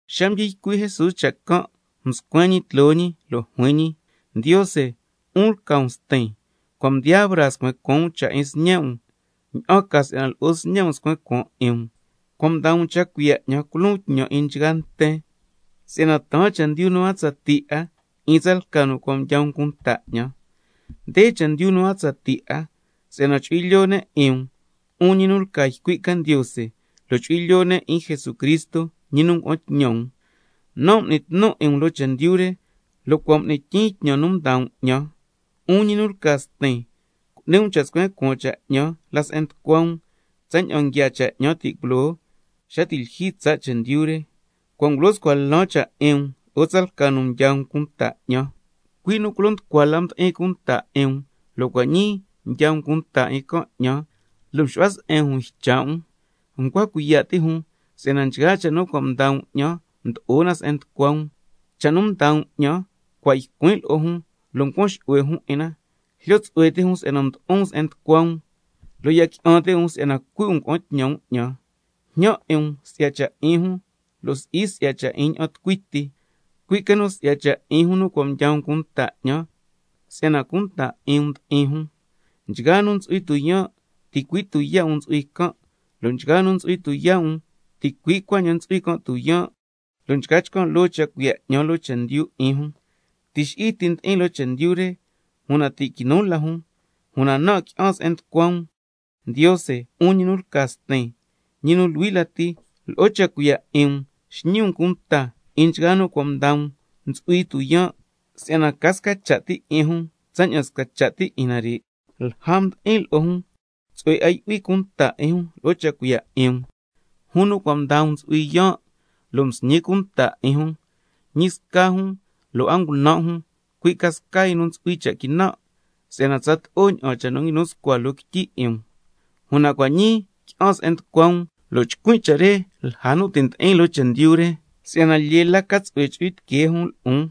Xa mdyi ycui' Jesús cha' can' mscuen ñi tloo ñi nde cuaan, lo' juin ñi: Ndiose, 'un lca um Stin, cua' mdiyaa braa scuen cuaan um cha' 'in Sñe' um, ña'an ca si'yana lo'o Sñe' um scuen cuaan 'in um. Si'yana cua' mdaa um cha' cuiya' 'ñan culon tñan 'in nchgaa nten, si'yana taan chendyu nu a tsatii 'a 'in tsalca nu cua' mdyaa um cunta 'ñan. Nde chendyu nu a tsatii 'a: Si'yana chu'hui lyoo ne' 'in um, 'un ñi nu lca ycui' ca Ndiose, lo' chu'hui lyoo ne' 'in Jesucristo, ñi nu ngua'an tñan um. Nan' m'nin tnun 'in um loo chendyu re, lo' cua' m'nin tyiin tñan nu mdaa um 'ñan. 'Un ñi nu lca Stin, cu'ni um cha' scuen cuaan cha' 'ñan la se'en nducua um, tsaña'an nguiaa cha' 'ñan ti' culoo xa ti' lyijyi tsaa' chendyu re. Cua' ngulyo scua lan cha' 'in um lo'o tsalca nu mdyaa um cunta 'ñan, cui' nu culo nducua la ndi'in cunta 'in um, lo' cua' ñii mdyaa um cunta 'in can' 'ñan, lo' mxu'hua se'en jun ycha' um. Ncua cuiya' ti' jun si'yana nchgaa cha' nu mdaa um 'ñan mdo'o na se'en nducua um, si'yana cua' ycuin' lo'o jun nchgaa cha' nu mdaa um 'ñan, lo' ncuan xu'hue jun 'in na, jlyo tsu'hue ti' jun si'yana mdo'on se'en nducua um, lo' ya qui'an ti' jun si'yana cui' um ngua'an tñan um 'ñan. Njñan 'in um si'ya cha' 'in jun, lo' si'i si'ya ña'an tucui ti, cui' ca nu si'ya cha' 'in jun nu cua' mdyaa um cunta 'ñan, si'yana cunta 'in um ndi'in jun. Nchgaa nu ntsu'hui tuyaan', ticui' tuyaa' um ntsu'hui can', lo' nchgaa nu ntsu'hui tuyaa' um, ticui' cuaña'an ntsu'hui can' tuyaan', lo' nchca chcan' loo cha' cuiya' 'ñan loo chendyu 'in jun. Tixi'i ti ndi'in loo chendyu re, una ti' quinu la jun, lo' nan' qui'an se'en nducua um. Ndiose, 'un ñi nu lca Stin, ñi nu luhui lati, lo'o cha' cuiya' 'in um xñi um cunta 'in nchgaa nu cua' mdaa um ntsu'hui tuyaan', si'yana ca sca cha' ti 'in jun tsaña'an sca cha' ti 'in nare'. Lja mdi'in lo'o jun, tsu'hue 'a yu'huin cunta 'in jun lo'o cha' cuiya' 'in um, jun nu cua' mdaa um ntsu'hui yaan', msñin cunta 'in jun, lo' ñi sca jun lo' a ngunan' jun, cui' ca sca yu nu ntsu'hui ca cha' quinan', si'yana tsato'o ña'an cha' nu cua' nguinu scua loo quityi 'in um. Una cua' ñii qui'an se'en nducua um, lo' chcuin' cha' re lja nu ti' ndi'in loo chendyu re, si'yana lyee la ca tsu'hue chu'hui tiquee jun lo'on.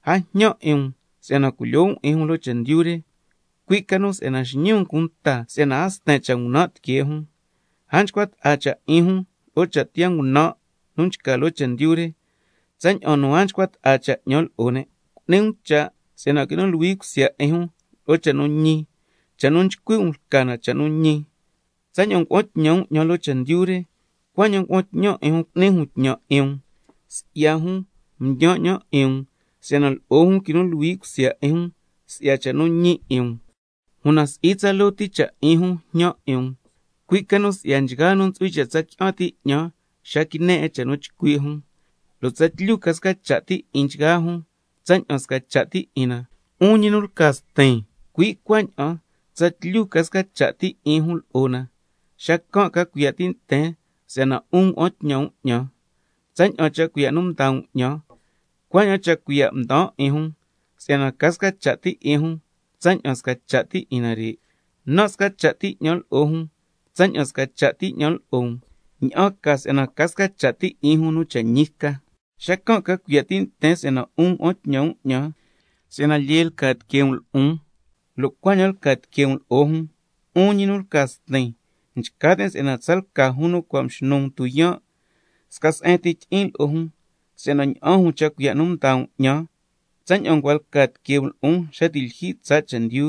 A njñan 'in um si'yana culyoo um 'in jun loo chendyu re, cui' ca nu xñi um cunta si'yana a sten cha' ngunan' tiquee jun. A nchcua ta'a cha' 'in jun lo'o cha' tiyaa ngunan' nu nchca loo chendyu re, tsaña'an nu a nchcua ta'a cha' 'ñan lo'o ne'. Cu'ni um cha' si'yana quinu luhui cusya 'in jun lo'o cha' nu ñi, cha' nu nchcui' um lca na cha' nu ñi. Tsaña'an ngua'an tñan um 'ñan loo chendyu re, cuaña'an ngua'an tñan 'in jun cu'ni jun tñan 'in um. Si'ya jun, ndyaan 'ñan 'in um, si'yana lo'o jun quinu luhui cusya 'in jun si'ya cha' nu ñi 'in um. Una si'i tsaloo ti cha' 'in jun njñan 'in um, cui' ca nu si'ya nchgaa nu ntsu'hui cha' tsa qui'an ti' 'ñan xa quine 'in cha' nu chcui' jun, si'yana tsatlyu ca sca cha' ti 'in nchgaa jun, tsaña'an sca cha' ti 'in na, 'un nu lca Stin, cui' cuaña'an tsatlyu ca sca cha' ti 'in jun lo'o na. Xacan' ca cuiya' ti' nten si'yana 'un ngua'an tñan um 'ñan. Tsaña'an cha' cuiya' mdaa um 'ñan, cuaña'an cha' cuiya' mdaan 'in jun, si'yana ca sca cha' ti 'in jun tsaña'an sca cha' ti 'in nare'. Nan' sca cha' ti 'ñan lo'o jun tsaña'an sca cha' ti 'ñan lo'o um, ña'an ca si'yana ca sca cha' ti 'in jun nu cha' ñi ca, xacan' ca cuiya' ti' nten si'yana 'un ngua'an tñan um 'ñan, si'yana lyee lca tiquee um lo'on, lo' cuaña'an lca tiquee um lo'o jun. 'Un ñi nu lca Stin, nchca tin' si'yana tsalca jun nu cua' mxnu um tuyaan', sca se'en ti tyi'in lo'o jun, si'yana ña'an jun cha' cuiya' nu mdaa um 'ñan, tsaña'an ncua lca tiquee um lo'on xa ti' lyijyi tsaa' chendyu.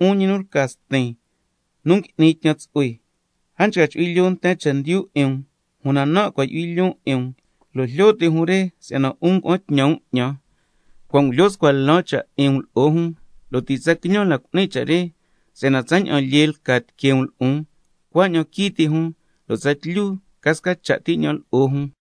'Un ñi nu lca Stin, nu ngui'ni tñan tsu'hue, a nchca chu'hui lyoo nten chendyu 'in um, una nan' cua' ndyu'hui lyoon 'in um, lo' jlyo ti' jun re si'yana 'un ngua'an tñan um 'ñan. Cua' ngulyo scua lan cha' 'in um lo'o jun, lo' ti' tsa quiñan cu'nin cha' re, si'yana tsaña'an lyee lca tiquee um lo'on, cuaña'an quii ti' jun, lo' tsatlyu ca sca cha' ti 'ñan lo'o jun.